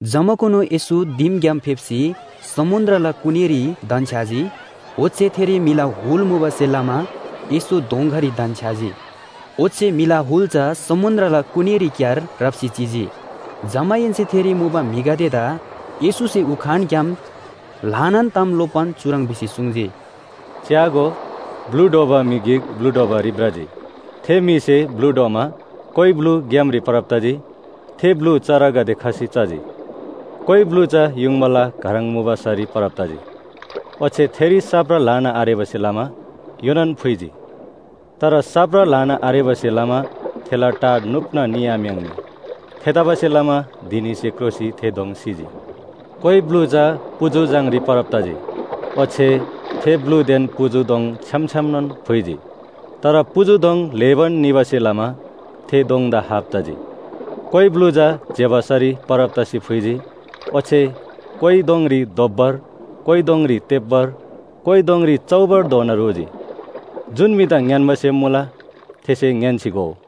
जमाकुनु येशू दिमग्‍याम फेप्‍सी समुन्‍द्रला कुनीरी धन्‍छ्‌याजी। ओच्‍छे थेरी म्‍हिला हुल मुबासेलमा येशू दोँगारी धन्‍छ्‌याजी। ओच्‍छे म्‍हिला हुल चा समुन्‍द्रला कुनीरीक्‍यार राप्‍सी चिजी। जमाहेन्‍से थेरी मुबा म्‍हिगदेदा येशूसे उखानग्‍याम ल्‍हानान ताम लोप्‍बान चुह्रङ् भिसी सुङ्जी, “च्‍यागो, ब्‍लु ढ्वबा म्‍हि गिक ब्‍लु ढ्वबारी भ्रजी। थे म्‍हिसे ब्‍लु ढ्वमा कोइ ब्‍लु ग्‍यामरी परब तजी, थे ब्‍लु चरागदे खसी चजी। कोइ ब्‍लु चा युङबाला घह्रङ मुबा सरी परब तजी, ओच्‍छे थेरी साप्रा ल्‍हाना आरेबासे लमा योनान फुइजी। तर साप्रा ल्‍हाना आरेबासे लमा थेला टा नुप्‍ना निआम्‍याङ्नी। थेतबासेलमा धिनीसे क्रोसी थे दोङ सिजी। कोइ ब्‍लु चा पुजु झाङरी परब तजी, ओच्‍छे थे ब्‍लुदेन पुजु दोङ छ्‌याम छ्‌यामनोन फुइजी। तर पुजु दोङ ल्‍हेबान निबासे लमा थे दोङदा हाप तजी। कोइ ब्‍लु चा ज्‍यबा सरी परब तसी फुइजी, ओच्‍छे कोइ दोङरी दोब्‍बर, कोइ दोङरी तेब्‍बर, कोइ दोङरी चौबरधोना रोजी। जुन म्‍हिदा ङ्‌यान्‍बा सेम मुला थेसे ङ्‌यान्‍सी घोउ।”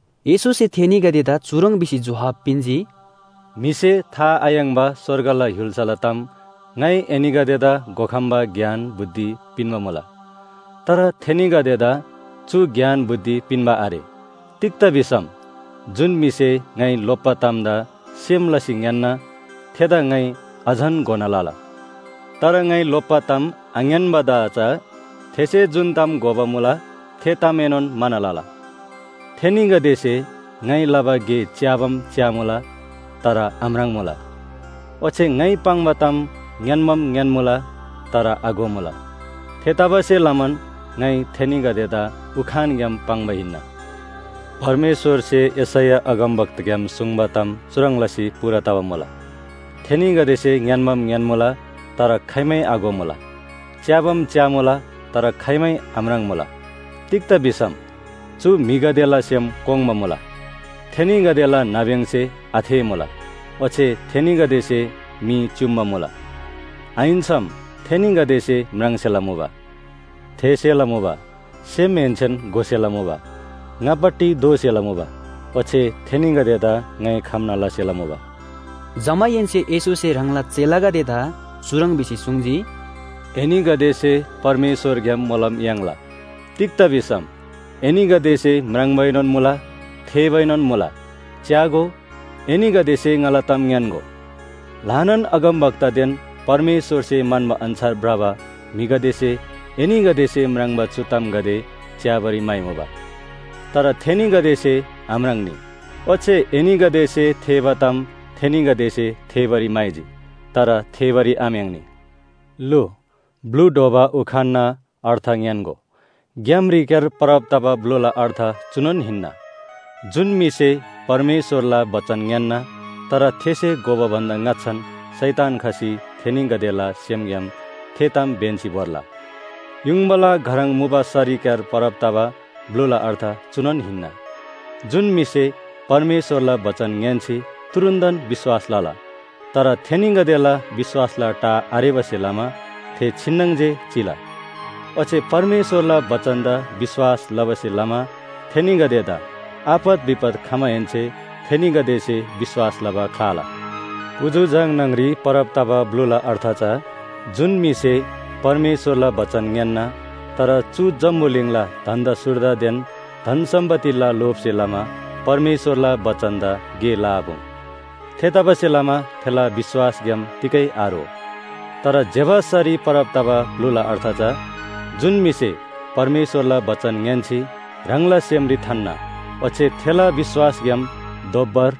येशूसे थेनीगदेदा चुह्रङ् भिसी जोहाब पिन्‍जी, “म्‍हिसे था आयाङ्‍बा स्‍वर्गला य्‍हुल्‍साला ताम ङाइ एनीगदेदा घोखम्‍बा ज्ञान बुद्धि पिन्‍बा मुला। तर थेनीगदेदा चु ज्ञान बुद्धि पिन्‍बा आरे। तिग्‍दा भिसम जुन म्‍हिसे ङाइ लोप्‍बा तामदा सेम लसी ङ्‌यान्‍ना, थेदा ङाइ अझन घोना लला। तर ङाइ लोप्‍बा ताम आङ्‌यान्‍बादा चा थेसे जुन घोबा मुला थे तामएनोन म्‍हाना लला। थेनीगदेसे ङाइ लबा गे च्‍याबाम च्‍यामुला तर आम्राङ्मुला, ओच्‍छे ङाइ पाङ्बा ताम ङ्‌यान्‍बाम ङ्‌यान्‍मुला तर आघोमुला। थेतबासेलमान ङाइ थेनीगदेदा उखानग्‍याम पाङ्बा हिन्‍ना। “परमेश्‍वरसे यशैया अगमवक्ताग्‍याम सुङ्बा ताम चुह्रङ् लसी पूरा तबा मुला, ‘थेनीगदेसे ङ्‌यान्‍बाम ङ्‌यान्‍मुला तर खाइमै आघोमुला, च्‍याबाम च्‍यामुला तर खाइमै आम्राङ्मुला, तिग्‍दा भिसम चु म्‍हिगदेला सेम कोङ्बा मुला, थेनीगदेला नाब्‍यङसे आथेःमुला, ओच्‍छे थेनीगदेसे मी च्‍युम्‍बा मुला। आहिन्‍सम थेनीगदेसे म्राङ्सेला मुबा, थेःसेला मुबा, सेमहेन्‍सेन घोसेला मुबा, ङापट्टि दोःसेला मुबा, ओच्‍छे थेनीगदेदा ङाइ खम्‍ना लसेला मुबा।’” जमाहेन्‍से येशूसे ह्राङला चेलागदेदा चुह्रङ् भिसी सुङ्जी, “एनीगदेसे परमेश्‍वरग्‍याम मोलम याङ्ला, तिग्‍दा भिसम एनीगदेसे म्राङ्बाएनोन मुला थेःबाएनोन मुला। च्‍यागो, एनीगदेसे ङाला ताम ङ्‌यान्‍गो, ल्‍हानान अगमवक्तादेन परमेश्‍वरसे म्‍हन्‍बा अन्‍छार भ्रबा म्‍हिगदेसे एनीगदेसे म्राङ्बा चु तामगदे च्‍याबारी म्‍हाइमुबा। तर थेनीगदेसे आम्राङ्‌नी, ओच्‍छे एनीगदेसे थेःबा ताम थेनीगदेसे थेःबारी म्‍हाइजी, तर थेःबारी आम्‍याङ्नी। “लु, ब्‍लु ढ्वबा उखानना अर्थ ङ्‌यान्‍गो। ग्‍यामरीक्‍यार परब तबा ब्‍लुला अर्थ चुनोन हिन्‍ना, जुन म्‍हिसे परमेश्‍वरला बचन ङ्‌यान्‍ना, तर थेसे घोबा भन्‍दा ङाच्‍छान शैतान खसी थेनीगदेला सेमग्‍याम थे ताम ब्‍यन्‍सी भोर्ला। युङबाला घह्रङ मुबा सरीक्‍यार परब तबा ब्‍लुला अर्थ चुनोन हिन्‍ना, जुन म्‍हिसे परमेश्‍वरला बचन ङ्‌यान्‍सी तुरुन्‍तन विश्‍वास लला। तर थेनीगदेला विश्‍वासला टा आरेबासे लमा, थे छिन्‍नङ जे चिला। ओच्‍छे परमेश्‍वरला बचनदा विश्‍वास लबासे लमा थेनीगदेदा आपत विपत खमाहेन्‍से थेनीगदेसे विश्‍वास लबा ख्‍लाला। पुजु झाङ न्‍हङरी परब तबा ब्‍लुला अर्थ चा जुन म्‍हिसे परमेश्‍वरला बचन ङ्‌यान्‍ना, तर चु जम्‍बुलिङला धन्‍दा सुर्दादेन धन सम्‍पत्तिला लोभसे लमा परमेश्‍वरला बचनदा गे लआपुङ्। थेतबासेलमा थेला विश्‍वासग्‍याम तिगै आरो। तर ज्‍यबा सरी परब तबा ब्‍लुला अर्थ चा जुन म्‍हिसे परमेश्‍वरला बचन ङ्‌यान्‍सी ह्राङला सेमरी थान्‍ना, ओच्‍छे थेला विश्‍वासग्‍याम दोब्‍बर,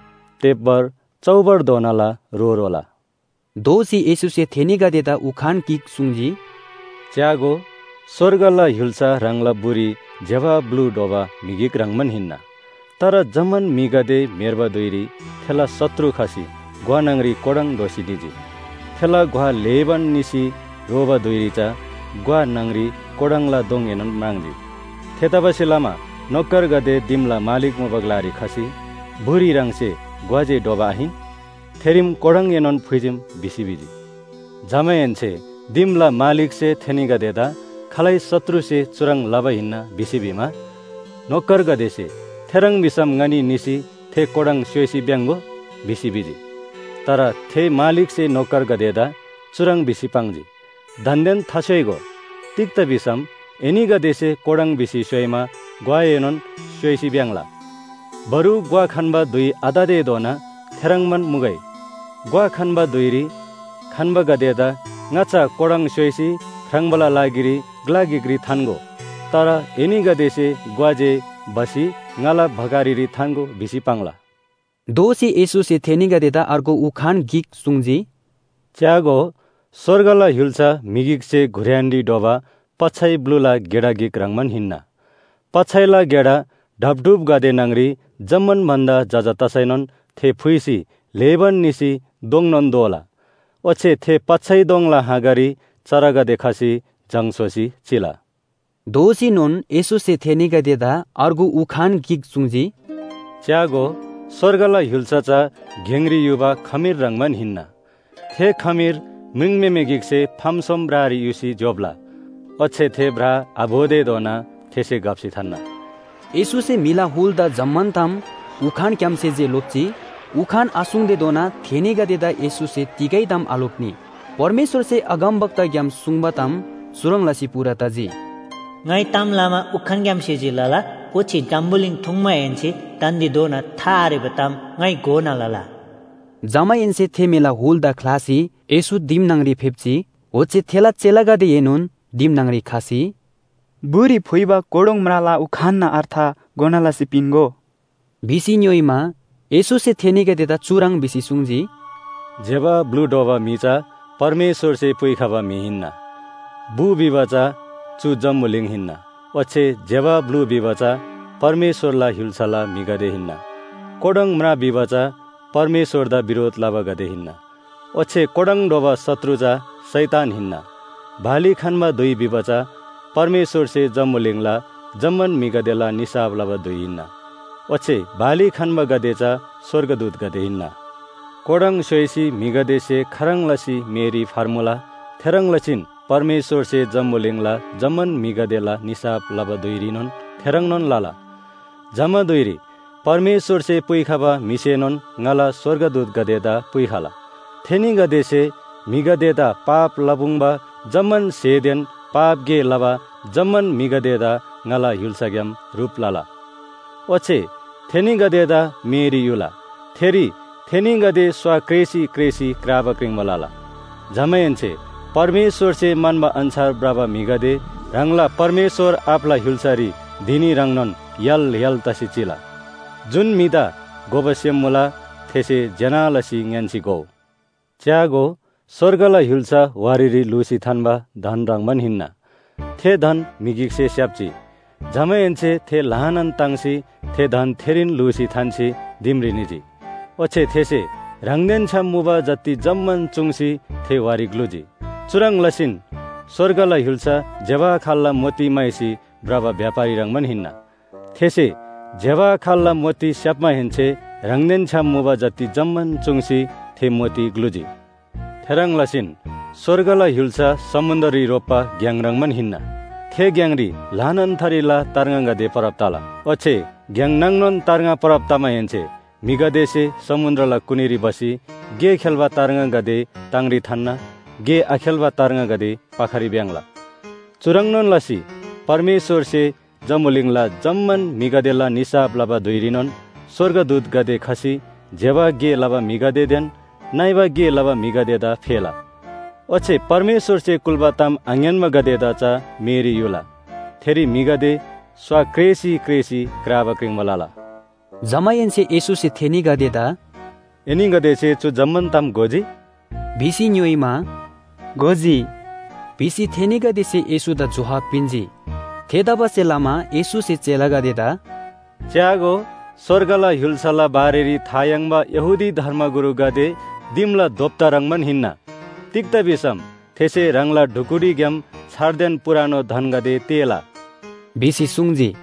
तेब्‍बर, चौबरधोनाला रो रोला।” दोःसी येशूसे थेनीगदेदा उखान गिक सुङ्जी, “च्‍यागो, स्‍वर्गला य्‍हुल्‍सा ह्राङला बुरी ज्‍यबा ब्‍लु ढ्वबा म्‍हि ह्रङ्‌बान हिन्‍ना। तर जम्‍मान म्‍हिगदे म्‍हेर्बा धुइरी थेला शत्रु खसी ग्‍वा न्‍हङरी कोडोङ ढ्‌वसी निजी। थे ग्‍वा ल्‍हेबान निसी रोबा धुइरी चा ग्‍वा न्‍हङ‍री कोडोङला दोङएनोन म्राङ्जी। “थेतबासेलमा नोकरगदे दिमला मालिक मुबा ग्‍लारी खसी ‘बुरी ह्राङसे ग्‍वा जे ढ्वबा आहिन? थेरीम कोडोङएनोन फुइजीम’ भिसी भिजी। “जमाहेन्‍से दिमला मालिकसे थेनीगदेदा ‘खालै शत्रुसे चुह्रङ् लबा हिन्‍ना’ भिसी भिमा, नोकरगदेसे ‘थेह्रङ् भिसम ङनी निसी थे कोडोङ स्‍योइसी भ्‍याङ्‍गो?’ भिसी भिजी। “तर थे मालिकसे नोकरगदेदा चुह्रङ् भिसी पाङ्जी, ‘दान्‍देन थास्‍योइगो, तिग्‍दा भिसम एनीगदेसे कोडोङ भिसी स्‍योइमा ग्‍वाएनोन स्‍योइसी भ्‍याङ्‍ला। बरु ग्‍वा खन्‍बा धुइ आततेधोना थेह्रङ्बान मुगै। ग्‍वा खन्‍बा धुइरी खन्‍बागदेदा ङाच्‍छा कोडोङ स्‍योइसी ख्राङ्बाला लागिरी ग्‍ला गिकरी थान्‍गो। तर एनीगदेसे ग्‍वा जे भसी ङाला भकारीरी थान्‍गो भिसी पाङ्ला।’” दोःसी येशूसे थेनीगदेदा अर्गु उखान गिक सुङ्जी, “च्‍यागो, स्‍वर्गला य्‍हुल्‍सा म्‍हि गिकसे घुर्‍यानरी ढ्वबा पच्‍छै ब्‍लुला गेडा गिक ह्रङ्‌बान हिन्‍ना। पच्‍छैला गेडा ढापढुपगदे न्‍हङ‍री जम्‍मान भन्‍दा जजा तसैनोन थे फुइसी ल्‍हेबान निसी दोङनोन दोला। ओच्‍छे थे पच्‍छै दोङला हाँगारी चरागदे खसी जङ स्‍होसी चिला।” दोःसीनोन येशूसे थेनीगदेदा अर्गु उखान गिक सुङ्जी, “च्‍यागो, स्‍वर्गला य्‍हुल्‍सा चा गेङरी युबा खमीर ह्रङ्‌बान हिन्‍ना। थे खमीर म्रिङम्‍हेमे गिकसे फाम सोम ब्रारी युसी ज्‍योप्‍ला। ओच्‍छे थे ब्रा आभोतेधोना थेसे घप्‍सी थान्‍ना।” येशूसे म्‍हिला हुलदा जम्‍मान ताम उखानग्‍यामसे जे लोप्‍जी। उखान आसुङ्तेधोना थेनीगदेदा येशूसे तिगै ताम आलोप्‍नी। परमेश्‍वरसे अगमवक्ताग्‍याम सुङ्बा ताम चुह्रङ् लसी पूरा तजी, “ङाइ ताम लमा उखानग्‍यामसे जे लला, ओच्‍छे जम्‍बुलिङ ठुङ्माहेन्‍से दान्‍देधोना था आरेबा ताम ङाइ घोना लला।” जमाहेन्‍से थे म्‍हिला हुलदा ख्‍लासी येशू दिम न्‍हङरी फेप्‍जी। ओच्‍छे थेला चेलागदेएनोन दिम न्‍हङरी खसी, “बुरी फुइबा कोडोङ म्राला उखानना अर्थ घोना लसी पिन्‍गो” भिसी ङ्‌योइमा, येशूसे थेनीगदेदा चुह्रङ् भिसी सुङ्जी, “ज्‍यबा ब्‍लु ढ्वबा म्‍हि चा परमेश्‍वरसे पुइखबा म्‍हि हिन्‍ना। बु भिबा चा चु जम्‍बुलिङ हिन्‍ना ओच्‍छे ज्‍यबा ब्‍लु भिबा चा परमेश्‍वरला य्‍हुल्‍साला म्‍हिगदे हिन्‍ना, कोडोङ म्रा भिबा चा परमेश्‍वरदा बिरोध लबागदे हिन्‍ना। ओच्‍छे कोडोङ ढ्वबा शत्रु चा शैतान हिन्‍ना, बाली खन्‍बा धुइ भिबा चा परमेश्‍वरसे जम्‍बुलिङला जम्‍मान म्‍हिगदेला निसाफ लबा धुइ हिन्‍ना। ओच्‍छे बाली खन्‍बागदे चा स्‍वर्गदूतगदे हिन्‍ना। कोडोङ स्‍योइसी म्‍हिगदेसे खाह्रङ् लसी मेरी फर्मुला थेह्रङ् लसीन परमेश्‍वरसे जम्‍बुलिङला जम्‍मान म्‍हिगदेला निसाफ लबा धुइरीनोन थेह्रङ्नोन लला। जमा धुइरी परमेश्‍वरसे पुइखबा म्‍हिसेनोन ङाला स्‍वर्गदूतगदेदा पुइखला। थेनीगदेसे म्‍हिगदेदा पाप लपुङ्बा जम्‍मान स्‍हेदेन पाप गे लबा जम्‍मान म्‍हिगदेदा ङाला य्‍हुल्‍साग्‍याम ह्रुप लला। ओच्‍छे थेनीगदेदा मेरी युला, थेरी थेनीगदे स्‍वा क्रेसी क्रेसी क्राबा क्रिङ्बा लला। जमाहेन्‍से परमेश्‍वरसे म्‍हन्‍बा अन्‍छार भ्रबा म्‍हिगदे ह्राङला परमेश्‍वर आबाला य्‍हुल्‍सारी धिनी ह्रङ्नोन य्‍हाल य्‍हाल तसी चिला। जुन म्‍हिदा घोबा सेम मुला थेसे ज्‍यना लसी ङ्‌यान्‍सी घोउ। “च्‍यागो, स्‍वर्गला य्‍हुल्‍सा वारीरी ल्‍हुसी थान्‍बा धन ह्रङ्‌बान हिन्‍ना। थे धन म्‍हि गिकसे स्‍याप्‍जी। जमाहेन्‍से थे ल्‍हानान ताङ्सी थे धन थेरीन ल्‍हुसी थान्‍सी दिमरी निजी। ओच्‍छे थेसे ह्राङदेन छ्‌याम मुबा जति जम्‍मान चुङ्सी थे वारी ग्‍लुजी। “चुह्रङ् लसीन स्‍वर्गला य्‍हुल्‍सा ज्‍यबा खाल्‍ला मोती म्‍हाइसी भ्रबा व्‍यापारी ह्रङ्‌बान हिन्‍ना। थेसे ज्‍यबा खाल्‍ला मोती स्‍याप्‍माहेन्‍से ह्राङदेन छ्‌याम मुबा जति जम्‍मान चुङ्सी थे मोती ग्‍लुजी। “थेह्रङ् लसीन स्‍वर्गला य्‍हुल्‍सा समुन्‍द्ररी रोप्‍बा घ्‍याङ ह्रङ्‌बान हिन्‍ना। थे घ्‍याङरी ल्‍हानान थरीला तार्ङागदे परब तला। ओच्‍छे घ्‍याङ नाङनोन तार्ङा परब तमाहेन्‍से म्‍हिगदेसे समुन्‍द्रला कुनीरी भसी गे खेल्‍बा तार्ङागदे ताङरी थान्‍ना, गे आखेल्‍बा तार्ङागदे पाखारी भ्‍याङ्‍ला। चुह्रङ्‌नोन लसी परमेश्‍वरसे जम्‍बुलिङला जम्‍मान म्‍हिगदेला निसाफ लबा धुइरीनोन स्‍वर्गदूतगदे खसी ज्‍यबा गे लबा म्‍हिगदेदेन नइबा गे लबा म्‍हिगदेदा फेला। ओच्‍छे परमेश्‍वरसे कुल्‍बा ताम आङ्‌यान्‍बागदेदा चा मेरी युला। थेरी म्‍हिगदे स्‍वा क्रेसी क्रेसी क्राबा क्रिङ्बा लला।” जमाहेन्‍से येशूसे थेनीगदेदा “एनीगदेसे चु ताम जम्‍मान घोजी?” भिसी ङ्‌योइमा, “घोजी” भिसी थेनीगदेसे येशूदा जोहाब पिन्‍जी। थेतबासेलमा येशूसे चेलागदेदा “च्‍यागो, स्‍वर्गला य्‍हुल्‍साला बारेरी था याङ्बा यहूदी धर्मगुरुगदे दिमला दोप्‍ता ह्रङ्‌बान हिन्‍ना। तिग्‍दा भिसम थेसे ह्राङला ढुकुटीग्‍याम छारदेन पुरानो धनगदे तेःला” भिसी सुङ्जी।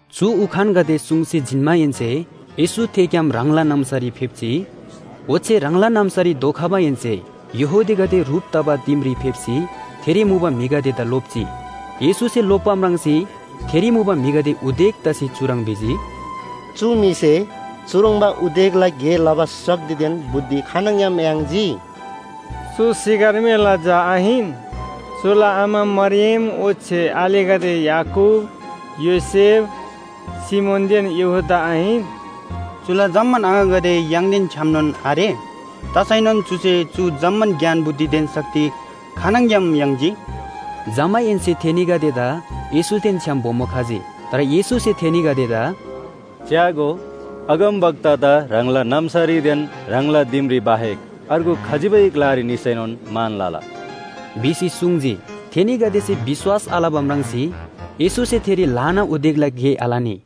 चु उखानगदे सुङ्सी जिन्‍माहेन्‍से येशू थेग्‍याम ह्राङला नाम्‍सारी फेप्‍जी। ओच्‍छे ह्राङला नाम्‍सारी धोखमाहेन्‍से यहूदीगदे ह्रुप तबा दिमरी फेप्‍सी थेरी मुबा म्‍हिगदेदा लोप्‍जी। येशूसे लोप्‍बा म्राङ्सी थेरी मुबा म्‍हिगदे उदेक तसी चुह्रङ् भिजी, “चु म्‍हिसे चुह्रङ्बा उदेकला गे लबा शक्तिदेन बुद्धि खानङग्‍याम याङ्जी? चु सिकर्मीला झा आहिन? चुला आमा मरियम ओच्‍छे आलेगदे याकूब, योसेफ, सिमोनदेन यहूदा आहिन? चुला जम्‍मान आङागदे य्‍हाङदेन छ्‌यामनोन आरे? तसैनोन चुसे चु जम्‍मान ज्ञान बुद्धिदेन शक्ति खानङग्‍याम याङ्जी?” जमाहेन्‍से थेनीगदेदा येशूदेन छ्‌याम बोमो खजी। तर येशूसे थेनीगदेदा “च्‍यागो, अगमवक्तादा ह्राङला नाम्‍सारीदेन ह्राङला दिमरी बाहेक अर्गु खजिबै ग्‍लारी निसैनोन मान लला” भिसी सुङ्जी। थेनीगदेसे विश्‍वास आलबा म्राङ्सी येशूसे थेरी ल्‍हाना उदेकला गे आलनी।